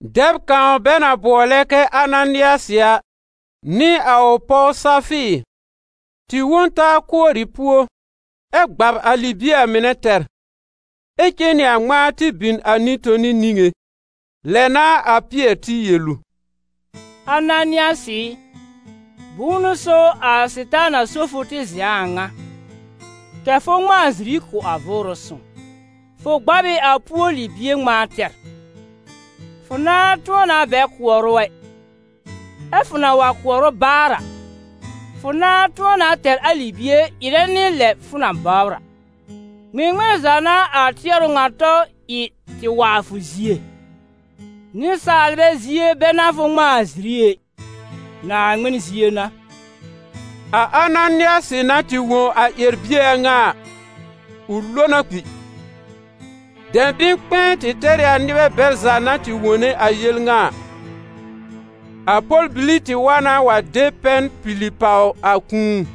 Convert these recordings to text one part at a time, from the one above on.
Dɛb kãw bɛ na bʋɔlɛ kɛ Ananɩasɩ a, nɩ a ʋ pɔw Safɩɩr, tɩ wõ n taa kʋɔrɩ puó, ɛ gbab a libie a mɩnɛ tɛr, ɛ cen nɩ a ŋmãa tɩ bin a nɩ-toni niŋé. Lɛ n'a a Pɩɛr tɩ yel ʋ: «Ananɩasɩ ɩ, bʋ̃ʋ n'ʋ so a Sɩtaana só fʋ tɩ zɛ̃ a ŋa, kɛ̀ fʋ ŋmãa ziri kʋ̀ a Vʋʋrʋ Sõw? Fʋ gbab ɩ a puó libie ŋmãa tɛr. Fʋ nãà tʋ̃ɔ na bɛ kʋɔr ʋ ɛ, ɛ fʋ na wa kʋɔr ʋ baar a, fʋ nãà tʋ̃ɔ na tɛr a libie ɩrɛ nɩ lɛ fʋ na bɔbr a. Ŋmɩŋmɩn za n'a a tɩɛrʋ ŋa tɔ ɩ tɩ wa a fʋ zie? Nɩsaalbɛ zie bɛ n'a fʋ ŋmãa a ziri ɛ, Naaŋmɩn zie n'a.» A Ananɩasɩ na tɩ wõ a ƴɛr-bie a ŋa a, ʋ lo na kpi. Dɛ̃bɩ̃-kpɛ̃ɛ tɩ tɛr ɩ a nɩbɛ bɛl za na tɩ wone a yel ŋa a. A pɔl-bili tɩ wa na wa de pɛn pili pàw a kũu,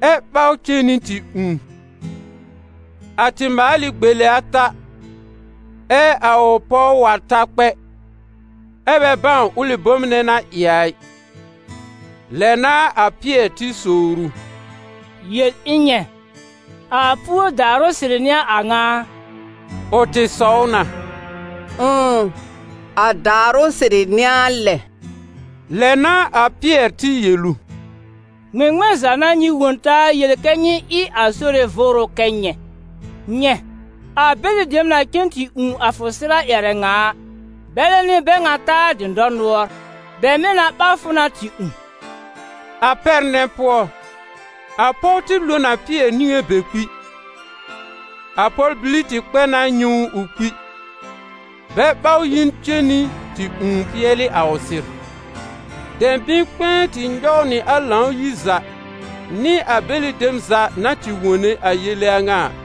ɛ ɓaw cen nɩ tɩ ũù. A tɩ maal ɩ gbele ata, ɛ a ʋ pɔw wa ta kpɛ, ɛ́ bɛ bãw ʋlɩ bom nɛ na ɩ a ɩ. Lɛ n'a a Pɩɛr tɩ sowr ʋ: «Yel ɩ̃ nyɛ̃, a puó daarʋ sɩrɩ n'ɩ a a ŋa a?» Ʋ tɩ sɔw na: «Ʋ̃ʋ, a daarʋ sɩrɩ n'ɩ a lɛ!» Lɛ n'a a Pɩɛr tɩ yel ʋ: «Ŋmɩŋmɩn za n'a nyɩ wõ taa yel kɛ nyɩ ɩ a Sore Vʋʋrʋ kɛ nyɛ̃? Nyɛ̃, a bɛlɩ dem na cen tɩ ũù a fʋ sɩr a ƴɛrɛ ŋa a, bɛlɛ n'ɩ bɛ ŋa ta a dɩ̃dɔr nʋɔr, bɛ mɩ̀ na ɓaw fʋ na tɩ ũù.» A pɛr nɛ pʋɔ, a pɔw tɩ lo n a Pɩɛr niŋé be kpi. A pɔl-bili tɩ kpɛ na nyɛ̃ ʋ ʋ kpi, bɛ ɓaw yi cen nɩ tɩ ũù pɩɛlɩ a ʋ sɩr. Dɛ̃bɩ̃-kpɛ̃ɛ tɩ nyɔw nɩ a Lãw-yir za nɩ a bɛlɩ dem za na tɩ wone a yele a ŋa a.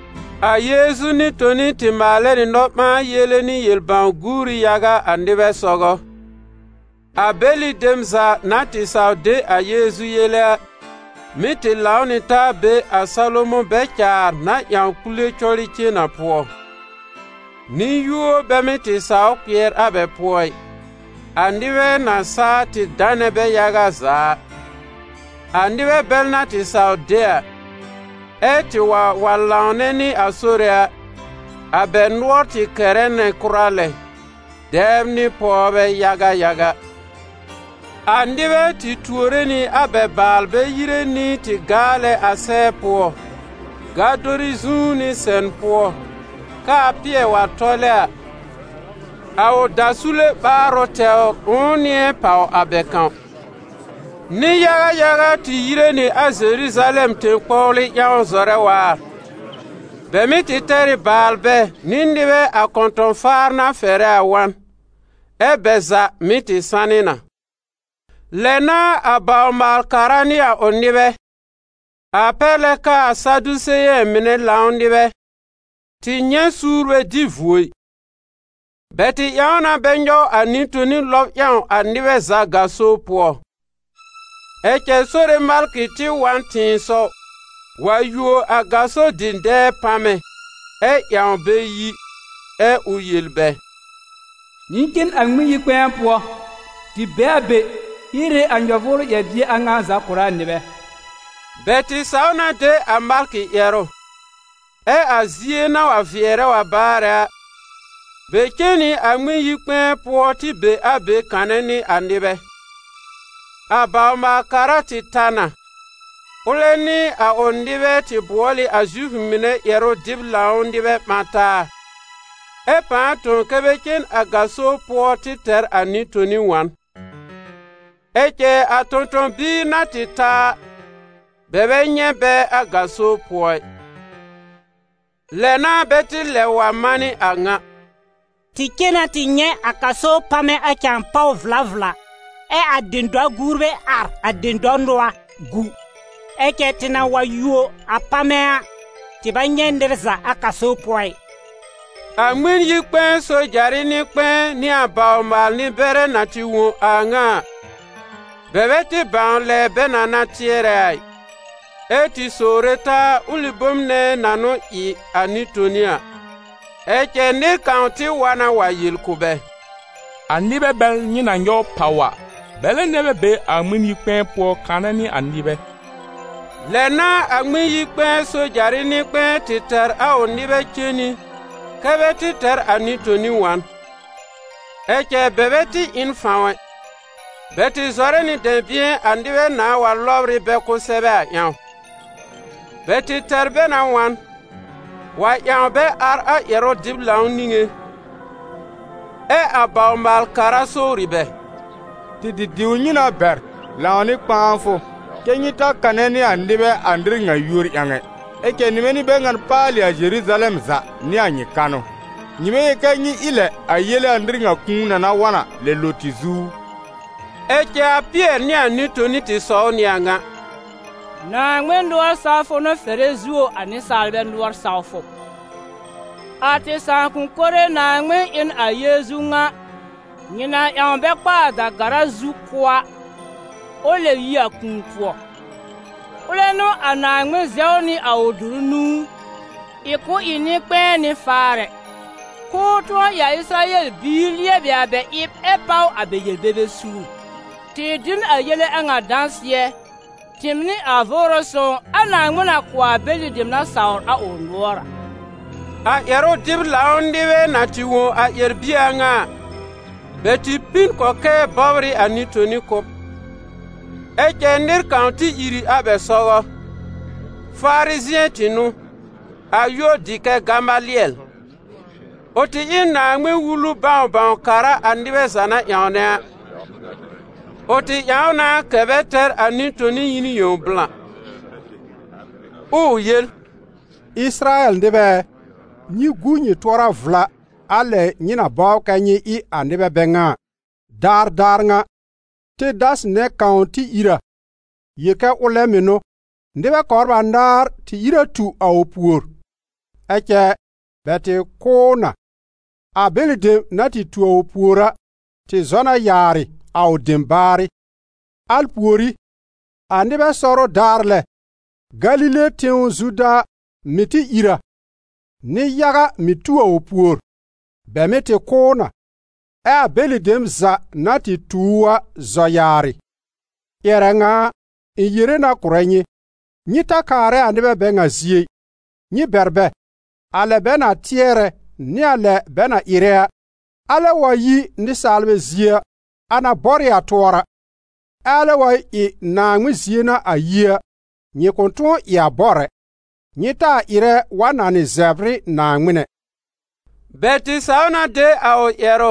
A Yeezu nɩ-toni tɩ maalɛ nɩ nɔ-ɓãa-yele nɩ yel-bãw-guuri yaga a nɩbɛ sɔgɔ. A bɛlɩ dem za na tɩ saw de a Yeezu yele a, mɩ́ tɩ lãw nɩ taa be a Salomɔ̃ bɛ-caar na ƴãw kpule cɔrɩ cen a pʋɔ. Nɩ-yũo bɛ mɩ́ tɩ sawr kpɩɛr a bɛ pʋɔ ɩ, a nɩbɛ na saa tɩ danɛ bɛ yaga za a. A nɩbɛ bɛl na tɩ saw de a, ɛ tɩ wa wa lãwnɛ nɩ a Sore a, a bɛ nʋɔr tɩ kɛrɛ nɩ kʋra lɛ, dɛbr nɩ pɔwbɛ yaga yaga. A nɩbɛ tɩ tuore nɩ a bɛ baalbɛ yire nɩ tɩ gaalɛ a sɛɛ pʋɔ, gadori zu nɩ sɛn pʋɔ, k'aa Pɩɛr wa tɔlɛ a, a ʋ dasule ɓaarʋ tɛwr ʋ̃ʋ nɩ̃ɛ pàw a bɛ kãw. Nɩ-yaga yaga tɩ yire nɩ a Zeruzalɛm tẽ-kpɔwlɩ ƴãw zɔrɛ waar. Bɛ mɩ́ tɩ tɛr ɩ baalbɛ nɩ nɩbɛ a kɔ̃tɔ̃-faar na fɛrɛ a wa n, ɛ́ bɛ za mɩ́ tɩ sanɩ na. Lɛ n'a a bawr-maal-kara nɩ a ʋ nɩbɛ, a pɛr lɛ k'aa Sadiseyɛ̃ mɩnɛ lãw nɩbɛ, tɩ nyɛ̃ suur bɛ dɩ vuo ɩ. Bɛ tɩ ƴãw na bɛ nyɔw a nɩ-toni lɔb ƴãw a nɩbɛ za gaso pʋɔ. Ɛ cɛ Sore malkɩ tɩ wa n tɩ̃ɩsɔw wa yuo a gaso dɩ̃dɛɛ pamɛ ɛ ƴãw bɛ yi, ɛ ʋ yel bɛ: «Nyɩ cen a Ŋmɩn-yi-kpɛ̃ɛ pʋɔ tɩ be a be hiere a nyɔ-vʋʋrʋ ƴɛr-bie a ŋa za kʋ̀rɛ a nɩbɛ!» Bɛ tɩ saw na de a malkɩ ƴɛrʋ, ɛ a zie na wa vɩɛrɛ wa baarɛ a, bɛ cen nɩ a Ŋmɩn-yi-kpɛ̃ɛ pʋɔ tɩ be a be kanɛ nɩ a nɩbɛ. A bawr-maal-kara tɩ ta na; ʋlɛ nɩ a ʋ nɩbɛ tɩ bʋɔl ɩ a Zifʋ mɩnɛ ƴɛrʋ-dɩb-lãw nɩbɛ ɓã taa, ɛ pãa tõ kɛ́ bɛ cen a gaso pʋɔ tɩ tɛr a nɩ-toni wa n. Ɛ cɛ a tõ-tõ-biir na tɩ ta a, bɛ bɛ nyɛ̃ bɛ a gaso pʋɔ ɩ. Lɛ n'a bɛ tɩ lɛb wa manɩ a ŋa: «Tɩ cen na tɩ nyɛ̃ a gaso pamɛ a cãa pàw vla vla, ɛ a dɩ̃dɔ-gurbɛ ar a dɩ̃dɔr nʋɔr gu; ɛ cɛ tɩ na wa yuo a pamɛ a, tɩ bɛ nyɛ̃ nɩr za a gaso pʋɔ ɩ.» A Ŋmɩn-yi-kpɛ̃ɛ sojarɩ nɩ-kpɛ̃ɛ nɩ a bawr-maal-nɩ-bɛrɛ na tɩ wõ a a ŋa a, bɛ bɛ tɩ bãw lɛ bɛ na na tɩɛrɛ a ɩ, ɛ́ tɩ sowre taa ʋlɩ bom nɛ na n'ʋ ɩ a nɩ-toni a. Ɛ cɛ nɩr kãw tɩ wa na wa yel kʋ̀ bɛ: «A nɩbɛ bɛl nyɩ na nyɔw pàw a, bɛlɛ nɛ bɛ be a Ŋmɩn-yi-kpɛ̃ɛ pʋɔ kanɛ nɩ a nɩbɛ.» Lɛ n'a a Ŋmɩn-yi-kpɛ̃ɛ sojarɩ nɩ-kpɛ̃ɛ tɩ tɛr a ʋ nɩbɛ cen nɩ kɛ́ bɛ tɩ tɛr a nɩ-toni wa n. Ɛ cɛ bɛ bɛ tɩ ɩ n fãw ɛ, bɛ tɩ zɔrɛ nɩ dɛ̃bɩ̃ɛ a nɩbɛ nãa wa lɔbr ɩ bɛ kʋsɛbɛ a ƴãw. Bɛ tɩ tɛr bɛ na wa n, wa ƴãw bɛ ar a ƴɛrʋ-dɩb-lãw niŋé, ɛ a bawr-maal-kara sowri bɛ: «Tɩ tɩ diw nyɩ na bɛr lãw nɩ kpãafʋ kɛ́ nyɩ ta kanɛ nɩ a nɩbɛ a nɩr ŋa yúor ƴãw ɛ? Ɛ cɛ nyɩmɛ n'ɩ bɛ ŋan paalɩ a Zeruzalɛm za nɩ a nyɩ kanʋ! Nyɩ bɛ yel kɛ nyɩ ɩ lɛ a yele a nɩr ŋa kũu na na wa n lɛb lo tɩ zu u!» Ɛ cɛ a Pɩɛr nɩ a nɩ-toni tɩ sɔw nɩ a ŋa: «Naaŋmɩn nʋɔr sawfʋ n'ʋ fɛrɛ zuo a nɩsaalbɛ nʋɔr sawfʋ. A tɩ sãakʋm mɩnɛ Naaŋmɩn ɩ n a Yeezu ŋa, nyɩ na ƴãw bɛ kpa a da-gara zu kʋ́ a, ʋ lɛb yi a kũu pʋɔ. Ʋlɛ n'ʋ a Naaŋmɩn zɛw nɩ a ʋ dʋrʋ nũu, ɩ k'ʋ ɩ nɩ-kpɛ̃ɛ nɩ faarɛ, k'ʋʋ tʋ̃ɔ ɩ a Ɩsɩrayɛl bibiir lɩɛbɩ a bɛ ɩb ɛ páw a bɛ yel-bebe suur. Tɩ dɩ n a yele a ŋa dãsɩɛ, tɩɩm nɩ a Vʋʋrʋ Sõw a Naaŋmɩn na kʋ̀ a bɛlɩ dem na sawr a ʋ nʋɔr a.» A ƴɛrʋ-dɩb-lãw nɩbɛ na tɩ wõ a ƴɛr-bie a ŋa a, bɛ tɩ pi n kɔkɛɛ bɔbr ɩ a nɩ-toni kʋ́b. Ɛ cɛ nɩr kãw tɩ ìr ɩ a bɛ sɔgɔ; Farizɩ̃ɛ tɩ n'ʋ, a yúor dɩ kɛ Gamalɩɛl. Ʋ tɩ ɩ n Naaŋmɩn-Wulu bãw-bãw-kara a nɩbɛ za na ƴãwnɛ a. Ʋ tɩ ƴãw na kɛ̀ bɛ tɛr a nɩ-toni yi n yẽw blã, ɛ ʋ yel: «Ɩsɩrayɛl nɩbɛ ɛ, nyɩ gu nyɩ tʋɔra vla a lɛ nyɩ na bɔbr kɛ́ nyɩ ɩ a nɩbɛ bɛ ŋa a. Daar daar ŋa, Tedasɩ nɛ kãw tɩ ìr a, yel kɛ ʋlɛ mɩ̀ n'ʋ; nɩbɛ kɔbr anaar tɩ ìr a tu a ʋ pùor. Ɛ cɛ bɛ tɩ kʋ́ ʋ na; a bɛlɩ dem na tɩ tu a ʋ pùor a, tɩ zɔ na yaarɩ, a ʋ dem baarɩ. Al pùorí, a nɩbɛ sɔrʋ daar lɛ, Galile tẽw Zuda mɩ̀ tɩ ìr a, nɩ-yaga mɩ̀ tu a ʋ pùor. Bɛ mɩ́ tɩ kʋ́ ʋ na, ɛ a bɛlɩ dem za na tɩ tu ʋ a zɔ yaarɩ. Ƴɛrɛ ŋa a, ɩ̃ yere na kʋ̀rɛ nyɩ: nyɩ ta kaarɛ a nɩbɛ bɛ ŋa zie ɩ, nyɩ bɛr bɛ. A lɛ bɛ na tɩɛrɛ nɩ a lɛ bɛ na ɩrɛ a, alɛ wa yi nɩsaalbɛ zie a, a na bɔr ɩ a tʋɔra. Ɛ alɛ wa ɩ Naaŋmɩn zie n'a a yi a, nyɩ kʋ̃ tʋ̃ɔ ɩ a bɔr ɛ. Nyɩ taa ɩrɛ wa nanɩ zɛbr ɩ Naaŋmɩn ɛ!» Bɛ tɩ saw na de a ʋ ƴɛrʋ,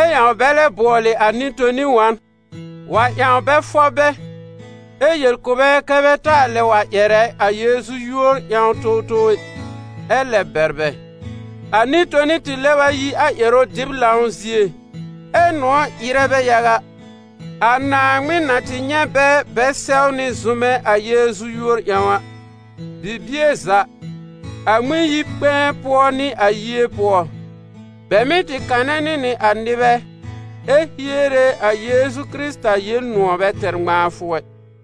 ɛ ƴãw bɛ lɛ bʋɔlɩ a nɩ-toni wa n, wa ƴãw bɛ fɔb bɛ, ɛ yel kʋ̀ bɛ kɛ bɛ taa lɛ wa ƴɛrɛ a Yeezu yúor ƴãw towtow ɛ, ɛ lɛb bɛr bɛ. A nɩ-toni tɩ lɛb a yi a ƴɛrʋ-dɩb-lãw zie, ɛ́ nʋ̃ɔ̀ ɩrɛ bɛ yaga, a Naaŋmɩn na tɩ nyɛ̃ bɛ bɛ sɛwnɩ zʋmɛ a Yeezu yúor ƴãw a. Bibie za, a Ŋmɩn-yi-kpɛ̃ɛ pʋɔ nɩ a yie pʋɔ, bɛ mɩ́ tɩ kanɛ nɩ nɩ a nɩbɛ, ɛ hiere a Yeezu, Kɩrɩta, Yel-nʋ̃ɔ̀ bɛ tɛr ŋmãafʋ ɛ.